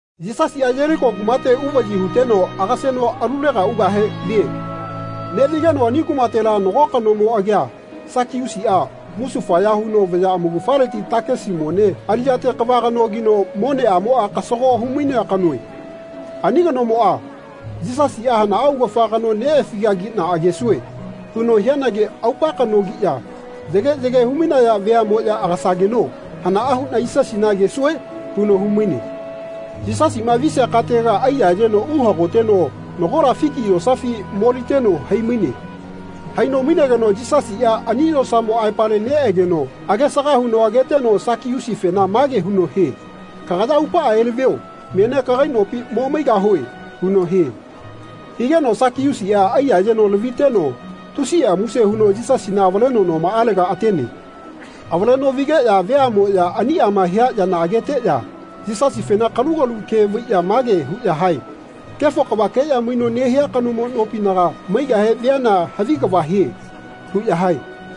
Yisasiꞌa Yeliko kumate uvaꞌyi huteno agaseno alulega ugahe vie. Neꞌvigeno ani kumatela nago kanomo agia Sakiusiꞌa musufaya huno vaya amaugafaleti takisi mone aliꞌyate kava kanogino moneꞌamoꞌa kasago humainea kanoe. Ani kanomoꞌa “Yisasiꞌa hanaꞌa augafa kano neꞌefigagiꞌna agesue.” huno hianagi aupa kanogiꞌya yage yage humainaya veaꞌmoꞌya agasageno “Hanaꞌa huꞌna Yisasina agesue?” huno humaine. Yisasiꞌma visia katega aiyayeno uhagoteno nagola fiki yosafi moliteno haimaine. Haino mainegeno Yisasiꞌa ani yosamo aepale neꞌeno agesaga huno ageteno Sakiusifena mage huno hie “Kagaya aupaꞌa elavio menia kagai nopi momaigahue.” huno hie. Higeno Sakiusiꞌa aiyayeno laviteno tusiꞌa muse huno Yisasina avaleno nomaꞌalega atene. Avaleno vigeꞌya veaꞌmoꞌya aniꞌama hia yana ageteꞌya Yisasifena kalugalu ke vaiꞌya mage huꞌya hae “Kefo kavakeꞌya maino nehia kanomo nopinaga maigahe viana havi kava hie.” huꞌya hae.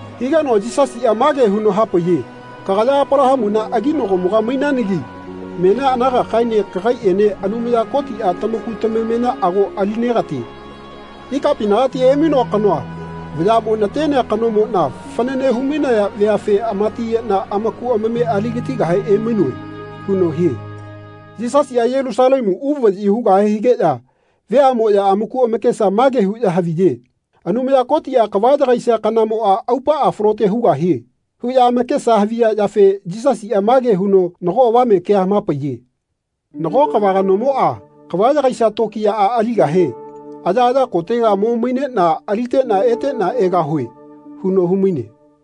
Higeno Yisasiꞌa mage huno hapaiye “Kagaya Apalahamuna aginagomoga mainanagi menia anagakaene kagaiꞌene Anumaya Kotiꞌa tamaku tamamena ago alinegatie. Ikapinagati emainoa kanoa vayaꞌmo natenea kanomoꞌna fanane humainaya veafe amatiyeꞌna amaku amame aligatigahe emainoe.” huno hie. Yisasiꞌa Yelusalemu uvaꞌyi hugahe higeꞌya veaꞌmoꞌya amaku amakesa mage huꞌya haviye “Anumaya Kotiꞌa kava yagaisia kanamoꞌa aupaꞌa falote hugahie.” huꞌya amakesa haviya yafe Yisasiꞌa mage huno nago avame kea hamapaiye. “Nago kava kanomoꞌa kava yagaisia tokiyaꞌa aligahe ‘Ayaꞌaya kotega mo maineꞌna aliteꞌna eteꞌna egahue.’ huno humaine.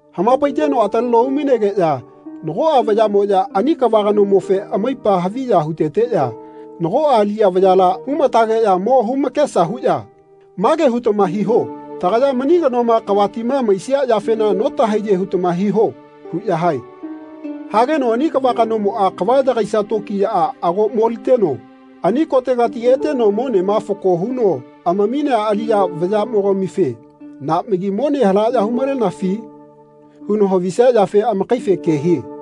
Hamapaiteno ataleno umainegeꞌya nagoꞌa vayaꞌamoꞌya ani kava kanomofe amaipa haviya huteteꞌya nagoꞌa aliꞌya vayala humatageꞌya mo humakesa huꞌya ‘Mage hutama hiho. Tagaya mani kanoma kavatima maisia yafena notahaiye hutama hiho.’ huꞌya hae. Hageno ani kava kanomoꞌa kava yagaisia tokiyaꞌa ago moliteno ani kotegati eteno monema fako huno amaminea aliꞌya vayamogamife ‘Naꞌmagi mone halaꞌya humalenafi?’ huno havisia yafe amakaife ke hie.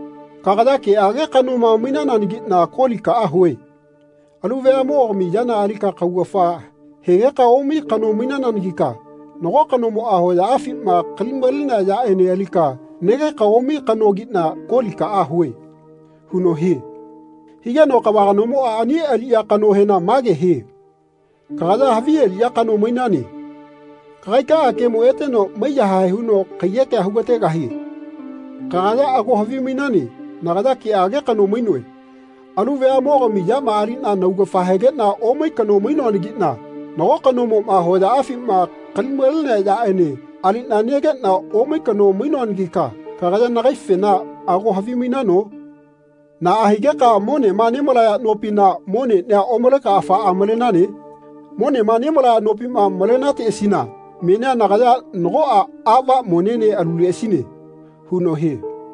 Kagaya keꞌage kanoma mainananagiꞌna kolikaꞌa hue. Alu veaꞌmogami yana alika kaugafa hegeka omai kano mainananagika nago kanomoꞌa hoyaꞌafima kali-malenea yaꞌene alika negeka omai kanogiꞌna kolikaꞌa hue.’ huno hie. Higeno kava kanomoꞌa ani aliꞌya kanohena mage hie ‘Kagaya havi aliꞌya kano mainane. Kagaikaꞌa kemo eteno maiyahae huno kaiyekea hugategahie. Kagaya ago havimainane nagaya keꞌage kano mainoe. Alu veaꞌmogami yama aliꞌna naugafa hegeꞌna omai kano mainoanagiꞌna nago kanomoꞌma hoyaꞌafima kali-malenea yaꞌene aliꞌna negeꞌna omai kano mainoanagika kagaya nagaifena ago havimainano? Naꞌa higeka monema nemalaya nopina moneꞌnia omaleka afaꞌa malenane. Monema nemalaya nopima malenateꞌasina menia nagaya nagoꞌa aꞌva monene aluleꞌasine.’ huno hie.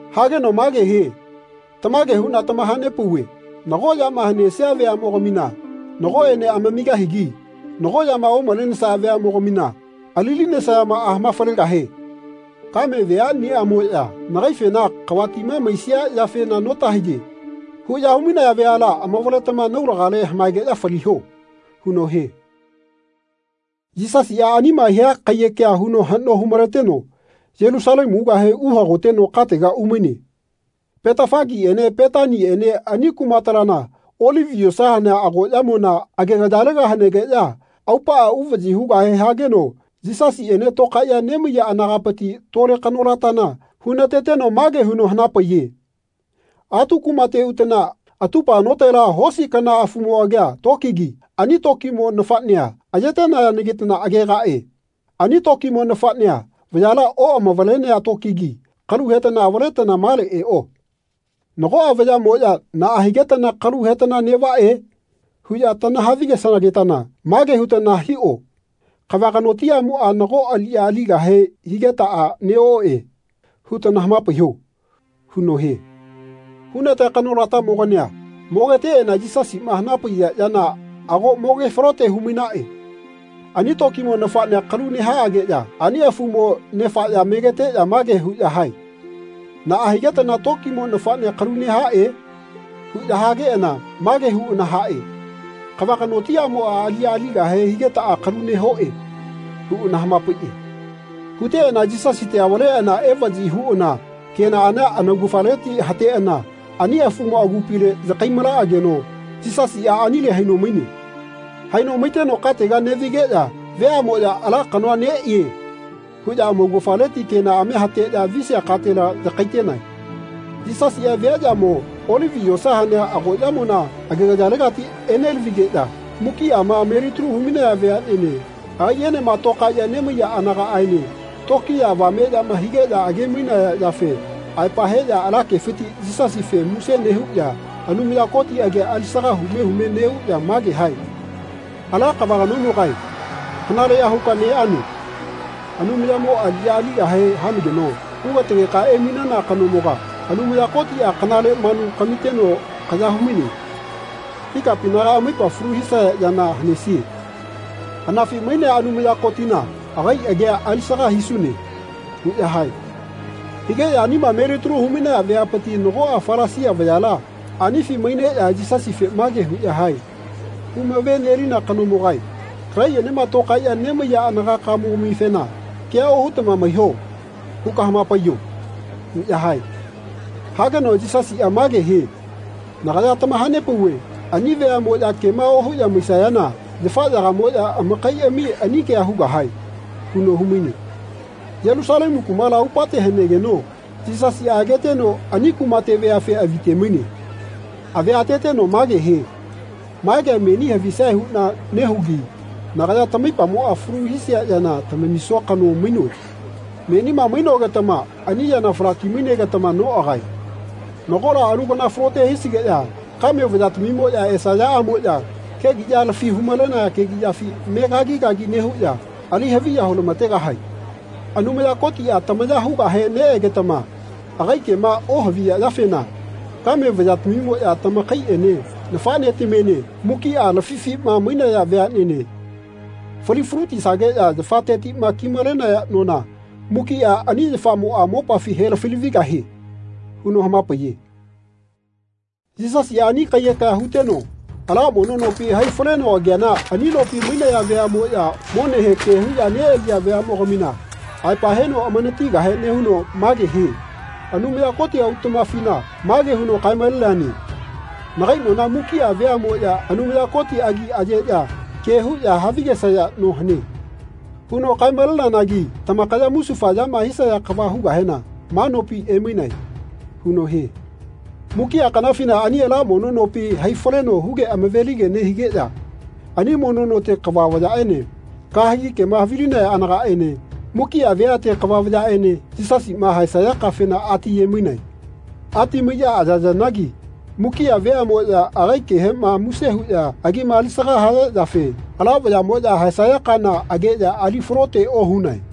Hageno mage hie ‘Tamage huꞌna tamahanepauve nago yama hanesia veaꞌmogamina nagoꞌene amamigahigi nago yama omalesaya veaꞌmogamina alilinesamaꞌa hanafalegahie. Kame veaꞌniꞌamoꞌya nagaifena ‘Kavatima maisia yafena notahaiye.’ huꞌya humainaya veala amavaletama naulagale hamaegeꞌya faliho.’ huno hie.” Yisasiꞌa anima hia kaiyekea huno haꞌno humaleteno Yelusalemu ugahe uhagoteno katega umaine. Petafasiene Petaniene ani kumatalana Olivi yosa hanea agoꞌyamona agegayalega hanegeꞌya aupaꞌa uvaꞌyi hugahe hageno Yisasiꞌene tokaeꞌya nemaiya anagapiti tole kanolatana hunateteno mage huno hanapaiye “Atu kumate utana atupa notela hosi kana afumo agia tokigi ani tokimo nafaꞌnea ayetenayanagitana agegaꞌe. Ani tokimo nafaꞌnea vayala oꞌamavalenea tokigi kalu hetana avaletana male eꞌo. Nagoꞌa vayaꞌmoꞌya ‘Naꞌa higetana kalu hetana neꞌvaꞌe?’ huꞌya tanahavigesagetana mage hutana hiꞌo ‘Kava kanotimoꞌa nago aliꞌya aligahe higetaꞌa neꞌoꞌe.’ hutana hamapaiꞌo.” huno hie. Hunatea kanolatamogania mogeteꞌana Yisasiꞌma hanapaiya yana ago moge falote humainaꞌe. Ani tokimo nafaꞌnea kalu nehaꞌageꞌya ani afumo nefaꞌya megeteꞌya mage huꞌya hae “Naꞌa higetana tokimo nafaꞌnea kalu nehaꞌe?” huꞌya hageꞌana mage huꞌana haꞌe “Kava kanotimoꞌa aliꞌya aligahe higetaꞌa kalu nehoꞌe.” huꞌana hamapaiꞌe. Huteꞌana Yisasite avaleꞌana evaꞌyi huꞌana kenaꞌania anaugafaleti hateꞌana ani afumo agupile yakai-malaꞌageno Yisasiꞌa anile haino maine. Haino maiteno katega neꞌvigeꞌya veaꞌmoꞌya “Ala kanoa neꞌie.” huꞌya amaugafaleti kenaꞌamia hateꞌya visia katela yakaitenae. Yisasiꞌa viaꞌyamo Olivi yosa hanea agoꞌyamona agegayalegati enelavigeꞌya mukiꞌama melitalu humainaya veaꞌnene agaiꞌenema tokaeꞌya nemaiya anagaꞌaene tokiya avameꞌyama higeꞌya age-mainaya yafe aepa heꞌya ala kefiti Yisasife muse nehuꞌya Anumaya Koti agia alisaga hume hume neꞌuꞌya mage hae “Ala kava kanomogae kanaleꞌya huka neꞌane. Anumayamo aliꞌya aligahe hanageno hugategeka emainana kanomoga Anumaya Kotiꞌa kanale manu kamiteno kaya humaine. Ikapinaga amaipa falu hisaya yana hanesie. Anafi mainea Anumaya Kotina agai agia alisaga hisune.” huꞌya hae. Hageꞌya anima melitalu humainaya veapiti nagoꞌa Falasia vayala anifi maineꞌya Yisasife mage huꞌya hae “Humavenelina kanomogae kagaiꞌenema tokaeꞌya nemaiya anagakamogamifena ‘Kea ohutama maiho.’ huka hamapaiyo.” huꞌya hae. Hageno Yisasiꞌa mage hie “Nagaya tamahanepauve ani veaꞌmoꞌya kema ohuꞌya maisayana yafaꞌyagamoꞌya amakaiꞌami ani kea hugahae.” huno humaine. Yelusalemu kumala aupate hanegeno Yisasiꞌa ageteno ani kumate veafe avite-maine. Avia ateteno mage hie “Ma kea meni havisae huꞌna nehugi nagaya tamaipamoꞌa falu hisia yana tamamisua kano mainoe. Menima mainogetama ani yana falaki mainegetama noꞌagae. Nagola alu kana falote hisigeꞌya kame vayatamimoꞌya esayaꞌamoꞌya kegiꞌya lafi humalenaya kegiꞌyafi me kagi kagi nehuꞌya ali haviya hulamategahae. Anumaya Kotiꞌa tamaya hugahe neꞌegetama agai kema ohaviya yafe kame vayatamimoꞌya tamakaiꞌene nafaꞌnetamiene mukiꞌa lafifima mainaya veaꞌnene falifalutisageꞌya yafatetiꞌma kimalenaya nona mukiꞌa ani yafamoꞌa mopafi helafilavigahie.” huno hamapaiye. Yisasiꞌa ani kaiyekea huteno ala mono nopi hai faleno ageana ani nopi mainaya veaꞌmoꞌya monehe ke huꞌya neꞌaliya veaꞌmogamina aepa heno amanatigahe nehuno mage hie “Anumaya Koti autaꞌmafina mage huno kae-maleneane ‘Nagai nona mukiꞌa veaꞌmoꞌya Anumaya Koti agi ayeꞌya ke huꞌya havigesaya no hane.’ huno kae-maleneanagi tamakaya musufa yama hisaya kava hugahena ma nopi emainae.” huno hie. Mukiꞌa kanafina ani ala mono nopi hai faleno huge amavelige nehigeꞌya ani mono note kava vayaꞌene kahegi kema havilinaya anagaꞌene mukiꞌa veate kava vayaꞌene Yisasima haesaya kafena atiyemainae. Ati maiꞌya ayayanagi mukiꞌa veaꞌmoꞌya agai kehema muse huꞌya agima alisaga haya yafe ala vayaꞌmoꞌya haesaya kana ageꞌya ali falote ohunae.